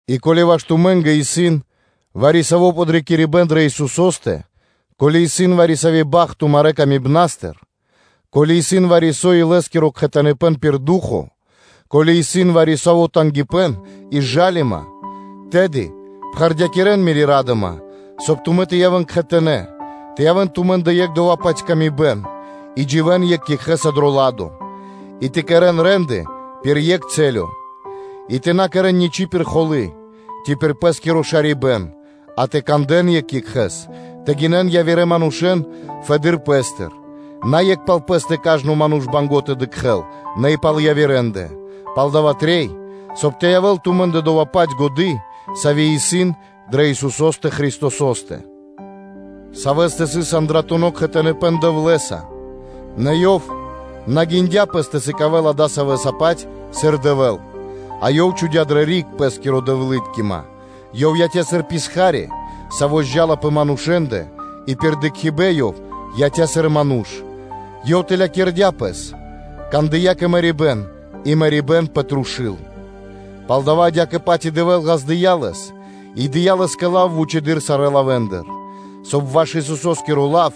И ко́ли ваш тумэ́нгэ исын вари-саво́ подрикирибэ́н дрэ Исусо́стэ, ко́ли исын вари-сави́ бахт тумарэ́ патыватыр кэ яви́р мануша́, ко́ли исын вари-саво́ илэ́скиро кхэтаныпэн пир Ду́хо, ко́ли исын вари-саво́ тангипэ́н и жалима, тэды пхэрдякирэн мири́ ра́дыма, соб (кай) тумэ́ тэ явэ́н кхэтанэ́, тэ явэ́н тумэ́ндэ екх дова́-паць выкэдыибэн, и дживэ́н екх екхэ́са дро ладо, и тэ кэрэ́н рэ́нды (де́лы) пир екх рэс (цэлё); и тэ на кэрэ́н ничи́ пир холы́, ци пир пэ́скиро шарибэ́н, а тэ кандэ́н екх екхэ́с, тэ гинэн явирэ манушэ́н фэды́р пэ́стыр; на екх пал пэ́стэ кажно ману́ш исын банго́ тэ дыкхэ́л, нэ и пал явирэндэ. Палдава́ трэй, соб (кай) тэ явэ́л тумэ́ндэ доя́-паць годы́, сави́ исын дрэ Исусо́стэ Христосо́стэ; Савэ́стэ сыс андратуно кхэтаныпэн Дэвлэ́са, нэ Ёв на гиндя Пэс тэ сыкавэ́л адасавэса-паць, сыр Дэвэ́л, а Ёв чхудя́ дрэ риг Пэ́скири Дэвлыткима, Ёв яця́ сыр писха́ри, саво́ зджа́ла пэ манушэ́ндэ, и пир дыкхибэ́н – Ёв яця́ сыр ману́ш; Ёв чхудя́ Пэс тэлэды́р, кандыя́ кэ мэрибэ́н, и мэрибэ́н пэ трушу́л. Палдава́ адя́кэ-паць и Дэвэ́л ґаздыя́ Лэс и дыя́ Лэ́скэ лав вучэды́р сарэ́ лавэ́ндыр, соб (кай) ваш Исусо́скиро лав,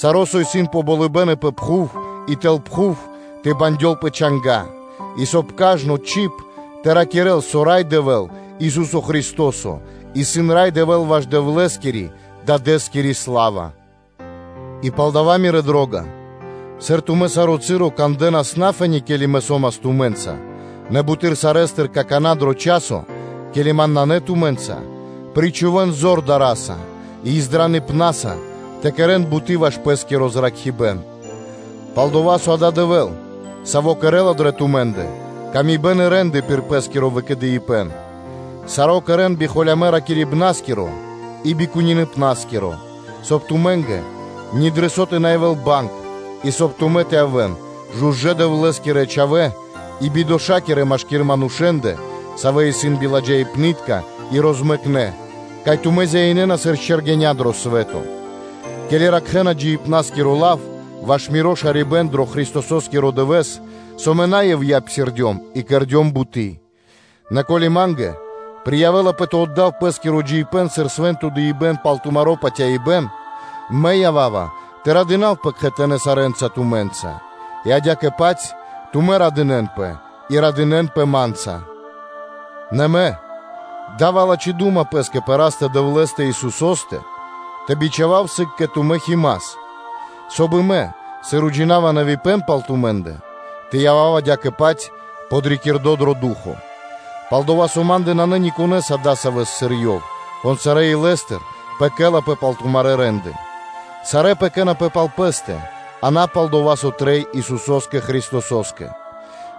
саро́, со исын пэ болыбэ́н, пэ пхув, и тэл пхув, тэ бандёл пэ чанга́, и, соб (кай) кажно чиб тэ ракирэ́л, со Рай Дэвэ́л, Ису́со Христо́со, исын Рай Дэвэ́л ваш Дэвлэ́скирэ-Дадэ́скири сла́ва. И палдава́, мирэ́ дро́га, сыр тумэ́ саро́ часо, ке́ли мэ сом тумэ́нца, нэ буты́р сарэ́стыр какана́ дро дава́ часо, ке́ли ман нанэ тумэ́нца, причхувэ́н зор дара́са и издраныпнаса тэ кэрэ́н буты́ ваш пэ́скиро зракхибэ́н, пал-дова́ со адава́ исын Дэвэ́л, Саво́ выкхарэла дрэ тумэ́ндэ во́ля и рэ́нды пир Пэ́скиро выкэдыибэн. Саро́ кэрэ́н би холямэ́ ракирибнаскиро и би кунипнаскиро, соб (кай) тумэ́нгэ ни дро со тэ на явэ́л банг и, соб (кай) тумэ́ тэ явэ́н жужэ́ (чыста) Дэвлэ́скирэ чхавэ́ и бидошакирэ машки́р манушэ́ндэ, савэ́ исын биладжаипнытка и розмэкнэ, кай тумэ́ зяинэна сыр чэргэня́ дро свэ́то, ке́ли ракхэна джиибна́скиро лав ваш миро шарибэ́н дро Христосо́скиро дывэ́с, со мэ на ивья́ (на напра́снэс) псирдём и кэрдём буты́. Нэ ко́ли ма́нгэ приявэлапэ тэ отдав пэ́скиро джиибэ́н сыр свэ́нто дыибэ́н пал тумаро́ патяибэ́н, то мэ сом радо, и мэ ява́ва тэ радынавпэ кхэтанэ́ сарэ́нца тумэ́нца. И адя́кэ-паць тумэ́ радынэ́нпэ, и радынэ́нпэ ма́нца. Нэ мэ радынава пэс дрэ Растэ – Дэвлэ́стэ Исусо́стэ тэ бичхавав сыг кэ тумэ́ Химас, соб (кай) и мэ, сыр мэ уджинава нэвипэн пал тумэ́ндэ, тэ явав адя́кэ-паць подрикирдо дро ду́хо (фа́но). Пал-дова́ со ма́ндэ нанэ никонэ́с адасавэс (нико́н адасаво́), сыр ёв исын, кон сарэ́ илэ́стыр пэкэлапэ (дэла туги) пал тумарэ́ рэ́нды (де́лы). Сарэ́ пэкэнапэ (заботисона) пал пэ́стэ, а на пал дова́, со трэй Исусо́скэ Христосо́скэ.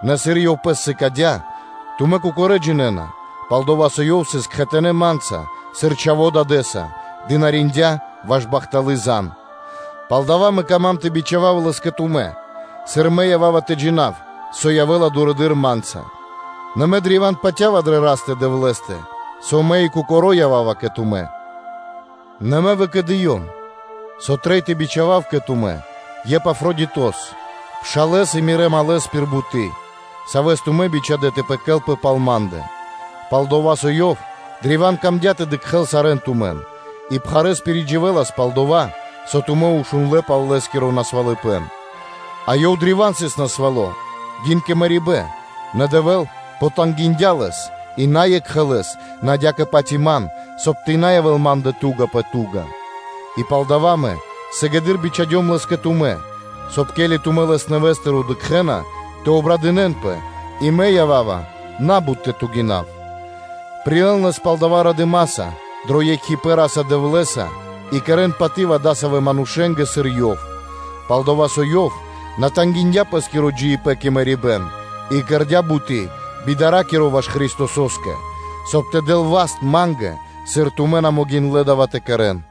Нэ сыр ёв (Хима) пэс сыкадя́, тумэ́ кокорэ́ джинэ́на, пал-дова́ со ёв сыс кхэтанэ́ ма́нца, сыр чхаво́ дадэ́са, дынариндя́ ваш бахталы́ зан (звесь). Палдава́ мэ кама́м тэ бичхавав лэс кэ тумэ́, сыр мэ ява́ва тэ джина́в, со явэ́ла дурэды́р ма́нца: нэ мэ древа́н патя́ва дрэ Растэ-Дэвлэ́стэ, со мэ и кокоро́ ява́ва кэ тумэ́; нэ мэ выкэдыём, со трэй тэ бичхавав кэ тумэ́ Епафродитос, пшалэ́с и мирэ́ малэс (другос) пир буты́, савэ́с тумэ́ бичхадэ́ тэ пэкэлпэ пал ма́ндэ; пал-дова́ со ёв древа́н мангдя́ тэ дыкхэ́л сарэ́н тумэн и пхарэ́с пиридживэлас пал дова́, со тумэ́ шундлэ́ пал лэ́скиро насвалыпэн; а ёв древа́н сыс насвало́, гин кэ мэрибэ́н, нэ Дэвэ́л потангиндя лэс, и на екхэ лэс, нэ адя́кэ-паць и ман, соб (кай) тэ на явэ́л ма́ндэ ту́га пэ ту́га. И палдава́ мэ сыгэды́р бичхадём лэс кэ тумэ́, соб (кай), ке́ли тумэ́ лэс нэвэ́стыр дыкхэ́на, тэ обрадынэнпэ, и мэ ява́ва на́бут тэ тугинав. Прилэ́н лэс палдава́ радыма́са дро екхипэ́н Ра́са-Дэвлэ́са и кэрэ́н паты́в адасавэ́ манушэ́нгэ, сыр ёв исын; пал-дова́ со ёв на тангиндя пэ́скиро джиибэ́н кэ мэрибэ́н и кэрдя́ буты́ би дара́киро ваш Христосо́скэ, соб (кай) тэ дэл васт ма́нгэ, сыр тумэ́ на могиндлэ́ дава́ тэ кэрэ́н.